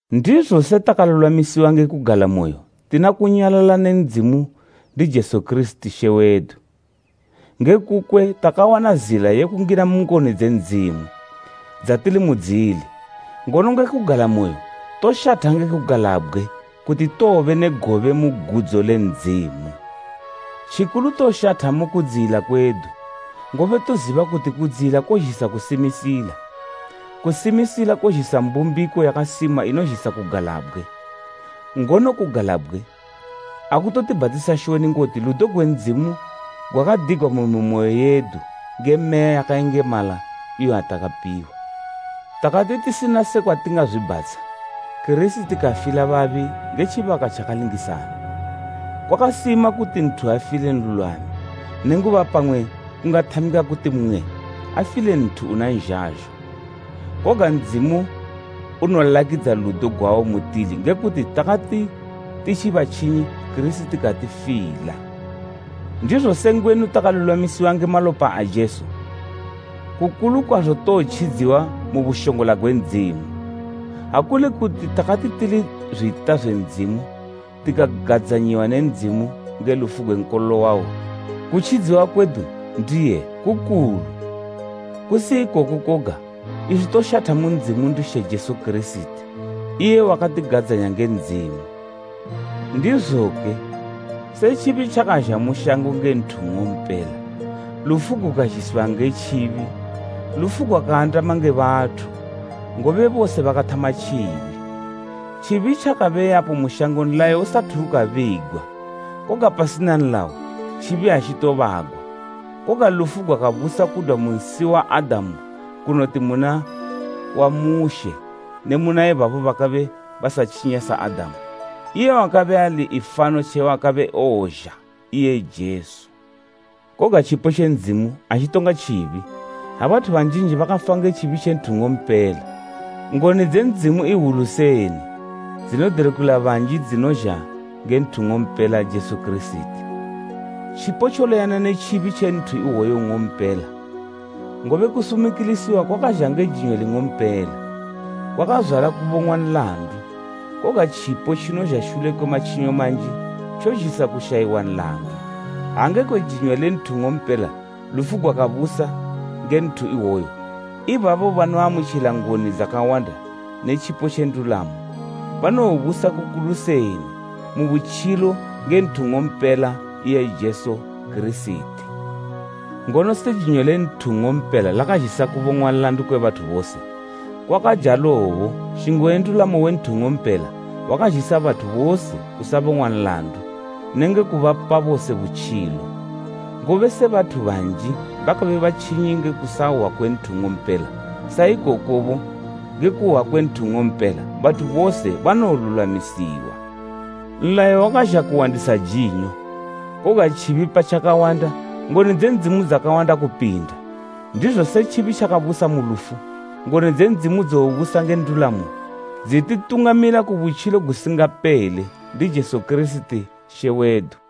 Ndizo se takalulwamisiwa nge kugalamoyo tina kunyalala ne Ndzimu ndi Jesu Kirisiti, She wedu. Ngekukwe takawana zila ye kungina mu ngoni dze Ndzimu, dzatili mudzili, ngono nge kugalamoyo toshatha nge kugalabgwe kuti towobe ne gobe mu gudzo le Ndzimu! Tjikulu toshatha mu kudziyila kwedu, ngobe toziba kuti kudziyila kozhisa kusimisila. Kusimisila kozhisa mbumbiko yakasima inozhisa kugalabgwe. Ngono kugalabgwe akutotibhatisa shoni ngoti ludo gwe Ndzimu gwakadigwa mu mimoyo yedu nge Meya yakayengemala iyo yatakapiwa. Takati tisina sekwa tingazwibhatsha, Kirisiti kafila babi nge tjibaka tjakalingisana. Kwakasima kuti nthu afile nlulwami, nenguba pamwe kungathamika kuti mmwe afile nthu una nzhazho. Koga Ndzimu unolakidza ludo gwawo mutili nge kuti takati titji batjinyi Kirisiti katifila! Ndizo se ngwenu takalulwamisiwa nge malopa a Jesu, kukulu kwazo towotjidziwa mu bushongola gwe Ndzimu! Ha kuli kuti takati tili zwita zwe Ndzimu, tikagadzanyiwa ne Ndzimu nge lufu gwe Nkololo wawo, kutjidziwa kwedu ndiye kukulu. Kusi ikoko koga, iswi toshatha mu Ndzimu ndi She Jesu Kirisiti, iye wakatigadzanya nge Ndzimu. Ndizoke, se tjibi tjakazha mu shango nge nthu nng'ompela, lufu gukazhisiwa nge tjibi, lufu gwakaandama nge bathu, ngobe bose bakathama tjibi. Tjibi tjakabe yapo mu shango nlayo usathu ukabigwa, koga pasina nlayo tjibi atjitobagwa. Koga lufu gwakabusa kudwa mu nsi wa Adamu kunoti muna wa Mushe ne muna ibabo bakabe basatjinya sa Adamu, iye wakabe ali ifano tje wakabe ewozha, iye Jesu. Koga tjipo tje Ndzimu atjitonga tjibi. Ha bathu banjinji bakafa nge tjibi tje nthu nng'ompela. Ngoni dze Ndzimu iwulu seni dzinodelukila banji dzinozha nge nthu nng'ompela Jesu Kirisiti. Tjipo tjoleyana ne tjibi tje nthu iwoyo nng'ompela: Ngobe kusumikilisiwa kwakazha nge jinyo ling'ompela, kwakazwala kubong'wa nlandu, koga tjipo tjinozha shule kwe matjinyo manji, tjozhisa kushayiwa nlandu. Ha ngekwe jinyo le nthu nng'ompela lufu gwakabusa nge nthu iwoyo, ibabo banoamutjila ngoni dzakawanda ne tjipo tje ndulamo, banowobusa kukulu seni mu butjilo nge nthu nng'ompela iye Jesu Kirisiti. Ngono se jinyo le nthu nng'ompela lakazhisa kubong'wa nlandu kwe bathu bose, kwakajalobo nshingo we ndulamo we nthu nng'ompela wakazhisila bathu bose kusabong'wa nlandu nenge kubapa bose butjilo. Ngobe se bathu banji bakabe batjinyi nge kusahwa kwe nthu nng'ompela, sa ikokobo, nge kuhwa kwe nthu nng'ompela, bathu bose banowolulwamisiwa. Nlayo wakazha kuwandisa jinyo, koga tjibi pa tjakawanda, ngoni dze Ndzimu dzakawanda kupinda. Ndizo se tjibi tjakabusa mu lufu, ngoni dze Ndzimu dzobusa nge ndulamo dzititungamilila ku butjilo gusingapele ndi Jesu Kirisiti She wedu.